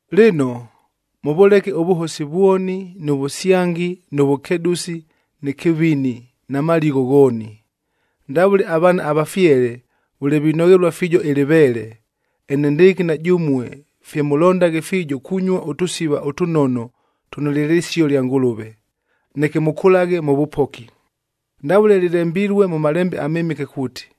Lɨno, mʉvʉleke ʉvʉhosi vwoni nʉ vʉsyangi nʉ vʉkedʉsi nɨ kɨvini na maligho ghooni. Ndavʉle avaana avafyele vʉle vinoghelua fiijo ɨlɨveele, enendɨɨkɨ na jʉmue fye mʉlondaghe fiijo kunyua ʉtʉsiva ʉtʉnono tʉno lye lɨsio lya Ngʉlʉve, neke mʉkʉlaghe mʉ vʉpoki. Ndavʉle lɨlembilue mʉ Malembe aMɨmɨke kuuti,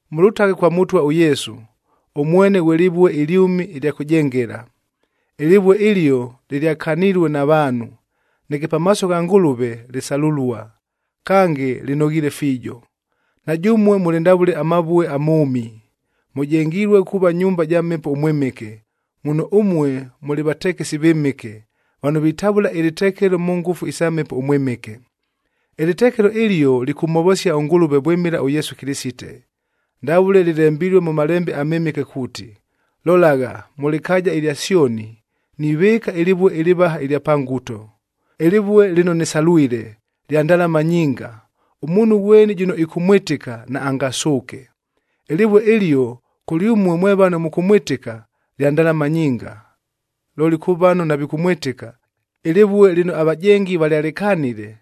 Mʉlʉtaghe kwa Mʉtwa ʉYesu, ʉmwene ghwe lɨvue ɨlyʉmi ɨlya kʉjengela. Ɨlɨvue ɨlio lɨlyakanilue na vaanhu, neke pamaaso gha Ngʉlʉve, lɨsalʉlua, kange lɨnoghiile fiijo. Na jʉmue mʉlɨ ndavʉle amavue amʉʉmi. Mʉjengilue kuuva nyumba ja Mhepo ʉMwɨmɨke, muno ʉmue mʉlɨ vatekesi vɨmɨke, vano vitavʉla ɨlɨtekelo mʉ ngʉfu isa Mhepo ʉMwɨmɨke. Ɨlɨtekelo ɨlio lɨkʉmhovosia ʉNgʉlʉve vwɨmɨla ʉYesu Kɨlɨsite. Ndavʉle lɨlembilue mʉ Malembe aMɨmɨke kuuti, “Lolagha, mʉ lɨkaaja ɨlya Syoni,b nivɨɨka ɨlɨvue ɨlɨvaha ɨlya pa nguto,c ɨlɨvue lɨno nɨsalwile, lya ndalama nyinga. Ʉmuunhu ghweni jʉno ɨkʉmwɨtɨka, Ɨlɨvue ɨlio kʉlyʉmue mwe vano mʉkʉmwɨtɨka, lya ndalama nyinga. Looli kʉ vano navikʉmwɨtɨka: “Ɨlɨvue lɨno avajengi valyalɨkanile,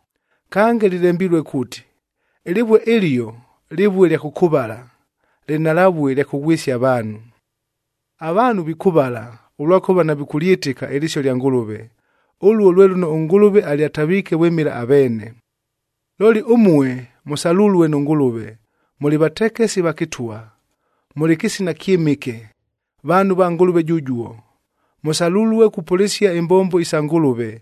Kange lɨlembilue kuuti, “Ɨlɨvue ɨlio, lɨvue lya kʉkʉvala, lɨnhalavue lya kʉghwɨsia avaanhu.”f Avaanhu vikʉvala, ʉlwakʉva navikʉlyɨtɨka ɨlɨsio lya Ngʉlʉve. Ʉluo lwe lʉno ʉNgʉlʉve alyataviike vwɨmɨla aveene. Looli ʉmue mʉsalulue nʉ Ngʉlʉve, mʉlɨ vatekesi va kɨtwa. Mʉlɨ kɨsina kyɨmɨke, vaanhu va Ngʉlʉve jʉjuo. Mʉsalulue kupʉlɨsia imbombo isa Ngʉlʉve,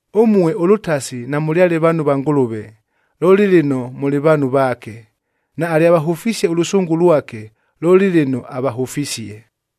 Ʉmue ʉlʉtasi namʉlyale vaanhu va Ngʉlʉve, looli lɨno mʉlɨ vaanhu vaake; naalyavahʉfisie ʉlʉsʉngʉ lwake, looli lɨno avahʉfisie.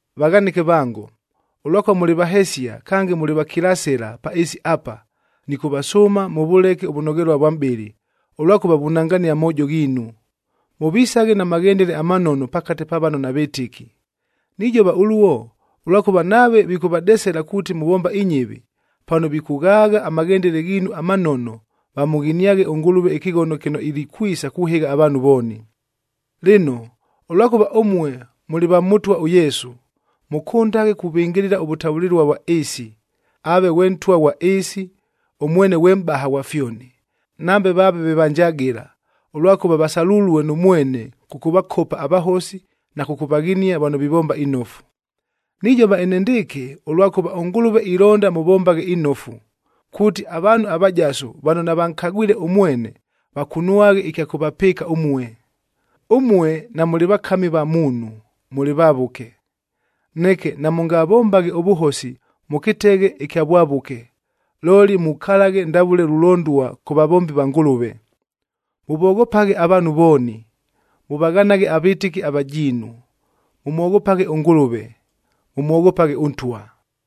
Vaghanɨke vango, ʉlwakʉva mʉlɨ vahesia kange mʉlɨ vakilasɨla pa ɨɨsi apa, nɨkʉvasʉʉma mʉvʉleke ʉvʉnoghelua ʉvwa mʼbɨlɨ ʉlwakʉva vunangania amoojo ghiinu. Mʉvisaghe na maghendele amanono pakate pa vano navɨtɨki. Nijova ʉluo, ʉlwakʉva nave vikʉvadesela kuuti muvomba inyɨvi, pano vikʉghaagha amaghendele ghiinu amanono, vamʉghiniaghe ʉNgʉlʉve ɨkɨghono kɨno ilikwisa kuhɨgha avaanhu vooni. Lɨno, ʉlwakʉva ʉmue mʉlɨ mwa Mʉtwa ʉYesu, mʉkʉndaghe kuvɨngɨlɨla ʉvʉtavʉlɨlua vwa ɨɨsi, aave ghwe ntwa ghwa ɨɨsi, ʉmwene ghwe mʼbaha ghwa fyoni, nambe vaave ve vanjagɨla, ʉlwakʉva vasalulue nʉ mwene kʉkʉvakopa avahosi na kʉkʉvaghinia vano vivomba inofu. Nijova enendɨɨkɨ, ʉlwakʉva ʉNgʉlʉve ilonda mʉvombaghe inofu, kuuti avaanhu avajasu vano navankagwile ʉmwene, vakunwaghe ɨkya kʉvapɨɨka ʉmue. Ʉmue namʉlɨ vakami va muunhu, mʉlɨ vavʉke. Neke namʉngavombaghe ʉvʉhosi mʉ kɨteghe ɨkya vwavʉke, looli mukalaghe ndavʉle lulondua kʉ vavombi va Ngʉlʉve. Mʉvoghopaghe avaanhu vooni. Mʉvaghanaghe avɨtɨki avajiinu. Mʉmwoghopaghe ʉNgʉlʉve. Mʉmwoghopaghe ʉntwa.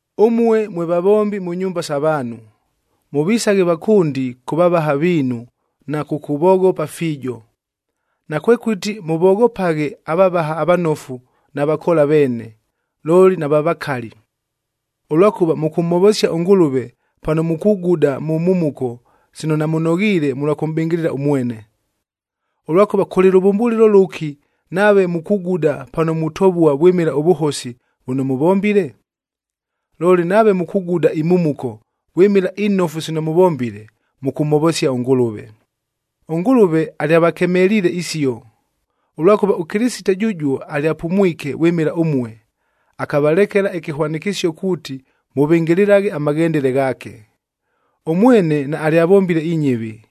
Ʉmue mwe vavombi mʉ nyumba sa vaanhu, mʉvisaghe vakʉndi kʉ vavaha viinu na kʉkʉvoghopa fiijo. Nakwekʉti mʉvoghopaghe avavaha avanofu na vakoola veene, looli nava vakali. Ʉlwakʉva mʉkʉmhovosia ʉNgʉlʉve pano mukuguda mʉ mhumuko sino namʉnoghiile mʉlwa kʉmʼbɨngɨlɨla ʉmwene. Ʉlwakʉva kʉlɨ lʉvʉmbʉlɨlo lʉki nave mukuguda pano mutovua vwɨmɨla ʉvʉhosi vʉno mʉvombile? Looli nave mukuguda imhumuko vwɨmɨla inofu sino mʉvombile, mʉkʉmhovosia ʉNgʉlʉve. ɄNgʉlʉve alyavakemeliile isio, ʉlwakʉva ʉKɨlɨsite jʉjuo alyapumwike vwɨmɨla ʉmue, akavalekela ɨkɨhwanɨkɨsio kuuti mʉvɨngɨlɨlaghe amaghendele ghaake. “Ʉmwene naalyavombile inyɨvi,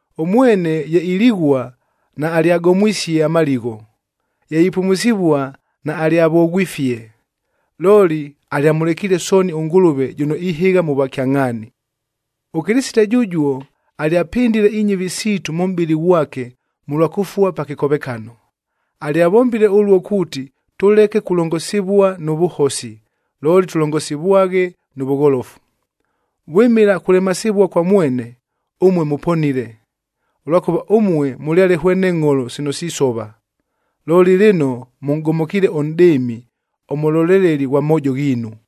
Ʉmwene ye ilighua naalyagomwisie amaligho, ye ipumusivua naalyavoghwifie, looli alyamʉlekiile sooni ʉNgʉlʉve jʉno ihɨgha mʉ vwakyangʼhaani. ɄKɨlɨsite jʉjuo alyapɨndile inyɨvi siitu mʉ mʼbɨlɨ ghwake mʉlwa kʉfua pa kɨkovekano. Alyavombile ʉluo kuuti tʉleke kulongosivua nʉ vʉhosi, looli tʉlongosivwaghe nʉ vʉgholofu. Vwɨmɨla kulemasivua kwa mwene, ʉmue mʉponile. Ʉlwakʉva ʉmue mʉlyale hwene ngʼholo sino sisova, looli lɨno mʉnʼgomokiile ʉNʼdɨɨmi, ʉMʉloleleli ghwa moojo ghiinu.